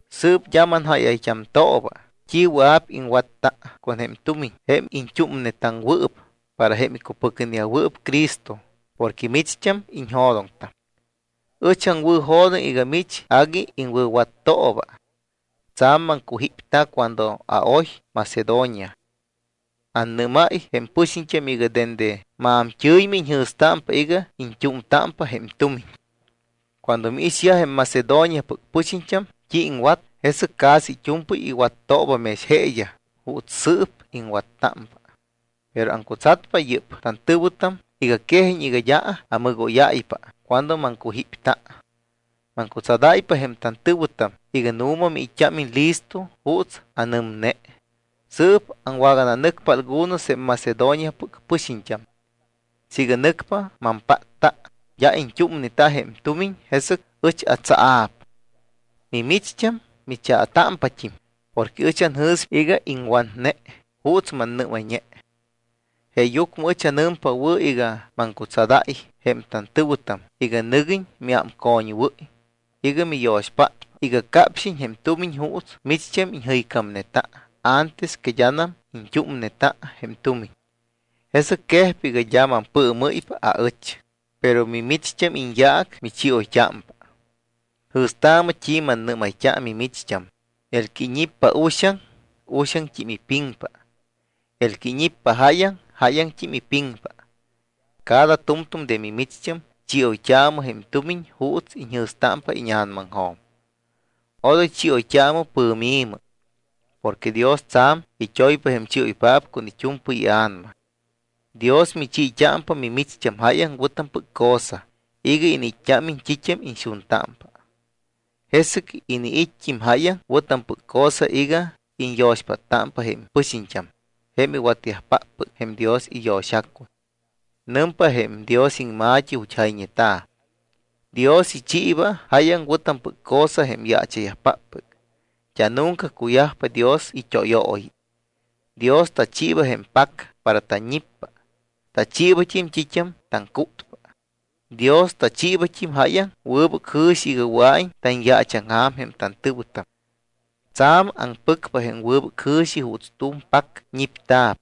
Sɨɨp d́a manjáyayt́amtooba t́i wɨa̱p iŋwatta con jém tumiñ jém iñt́úmnetaŋwɨɨp para jém icupɨcneyajwɨɨp Cristo porque micht́am iñjo̱doŋtam. Ɨch aŋwɨ̱jo̱doŋ iga mich agui iŋwɨ̱wattooba. Tsa̱m maŋcujípta cuando aoy Macedonia. Annɨ́máy jém pɨxiñt́am iga dende maamt́ɨ̱ymɨ iñjɨ̱stámpa iga iñt́úmtámpa jém tumiñ. Cuando miixyaj jém Macedoniapɨc pɨxiñt́am t́i iŋwat, jesɨc casi it́u̱mpɨy iwattooba mex jeeyaj juuts sɨɨp iŋwattámpa. Pero aŋcutsatpa yɨ́p tantɨ̱wɨtam iga quejiñ iga d́a amɨgóypa cuando maŋcujípta. Maŋcutsadáypa jém tantɨ̱wɨtam iga nu̱ma miit́t́ámiñ listo juuts anɨmne. Sɨɨp aŋwagananɨcpa algunos jém Macedoniapɨc pɨxiñt́am. Siiga nɨcpa mampátta d́a iñt́úmneta jém tumiñ, jesɨc ɨch atsaa̱p; mimicht́am michaatámpat́im porque ɨch anjɨ̱spa iga iŋwatne juuts mannɨ́mayñe. Jeeyucmɨ ɨch anɨmpa wɨ̱ iga maŋcutsadáy jém tantɨ̱wɨtam iga nɨguiñ miámcoñwɨ́y iga miyo̱xpátpa iga capxiñ jém tumiñ juuts micht́am iñjɨycámneta antes que d́anam iñt́úmneta jém tumiñ. Jesɨc quejpa iga d́a mampɨɨmɨ́ypa aɨch, pero mimicht́am iñyaac michioyt́ámpa. Jɨ̱staamɨ t́i mannɨ́mayt́a mimicht́am, el que iñippa uxaŋ, uxaŋt́im ipiŋpa. El que iñippa jáyaŋ, jáyaŋt́im ipiŋpa. Cada tu̱mtu̱m de micht́am chioyt́aamɨ jém tumiñ juuts iñjɨ̱stámpa íña̱namaŋjo̱m. Odoy chioyt́aamɨ pɨ̱mi̱mɨ. Porque Dios tsa̱m it́oypa jém chioypáppɨc con it́u̱mpɨy ia̱nama. Dios michiit́ámpa mimicht́am jáyaŋ wɨ̱tampɨc cosa iga iniit́t́ámiñ t́it́am iñxuntámpa. Jesɨc iniit́t́im jáyaŋ wɨ̱tampɨc cosa iga iñyo̱xpáttámpa jém pɨxiñt́am jém iwatyajpáppɨc jém Dios iyo̱xacuy. Nɨmpa jém Dios iŋma̱t́i ju̱t́ jayñeta̱: Dios ichiiba jáyaŋ wɨ̱tampɨc cosa jém yaacha̱yajpáppɨc. D́a nunca cuyajpa Dios it́óyooyi. Dios tachiiba jém pac para tanñippa. Tachiibat́im t́it́am taŋcútpa. Dios tachiibat́im jáyaŋ wɨbɨc jɨ̱xi iga wɨa̱iñ tanyaachaŋja̱m jém tantɨ̱wɨtam. Tsa̱m aŋpɨcpa jém wɨbɨc jɨ̱xi juuts tu̱m pac ñipta̱p.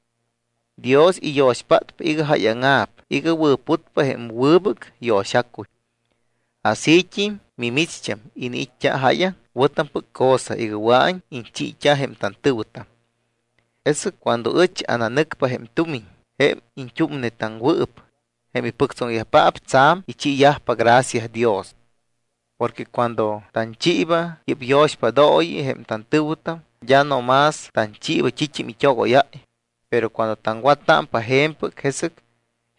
Dios iyo̱xpátpa iga jáyaŋa̱p, iga wɨ̱putpa jém wɨbɨc yo̱xacuy. Asít́im mimicht́am iniit́t́a jáyaŋ wɨ̱tampɨc cosa iga wɨa̱iñ iñchiit́a jém tantɨ̱wɨtam. Jesɨc cuando ɨch ananɨcpa jém tumiñ, jém iñt́úmnetaŋwɨɨp, jém ipɨctsoŋyajpaap tsa̱m ichiiyajpa gracia Dios. Porque cuando tanchiiba yɨ́p yo̱xpádooyi jém tantɨ̱wɨtam, d́a no más tanchiiba t́it́am it́ogóyáy, pero cuando taŋwattámpa je̱mpɨc, jesɨc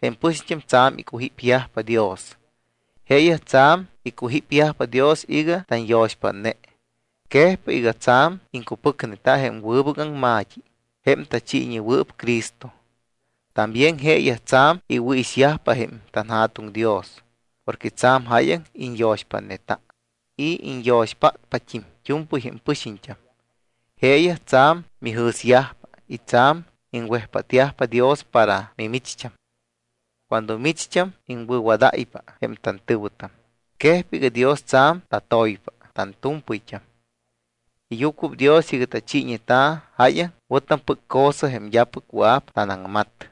jém pɨxiñt́am tsa̱m icujípyajpa Dios. Jeeyaj tsa̱m icujípyajpa Dios iga tanyo̱xpátne. Quejpa iga tsa̱m iŋcupɨcneta jém wɨbɨc aŋma̱t́i, jém tachiiñewɨɨp Cristo. También jeeyaj tsa̱m iwɨ̱ixyajpa jém tanJa̱tuŋ Dios porque tsa̱m jáyaŋ iñyo̱xpátneta y iñyo̱xpátpat́im it́u̱mpɨy jém pɨxiñt́am. Jeeyaj tsa̱m mijɨ̱syajpa y tsa̱m iŋwejpátyajpa Dios para mimicht́am. Cuando micht́am iŋwɨ̱wadáypa jém tantɨ̱wɨtam, quejpa iga Dios tsa̱m tatoypa tantu̱mpɨyt́am. Iyucuɨpdios iga tachiiñeta jáyaŋ wɨ̱tampɨc cosa jém d́apɨc wɨa̱p tanaŋmat.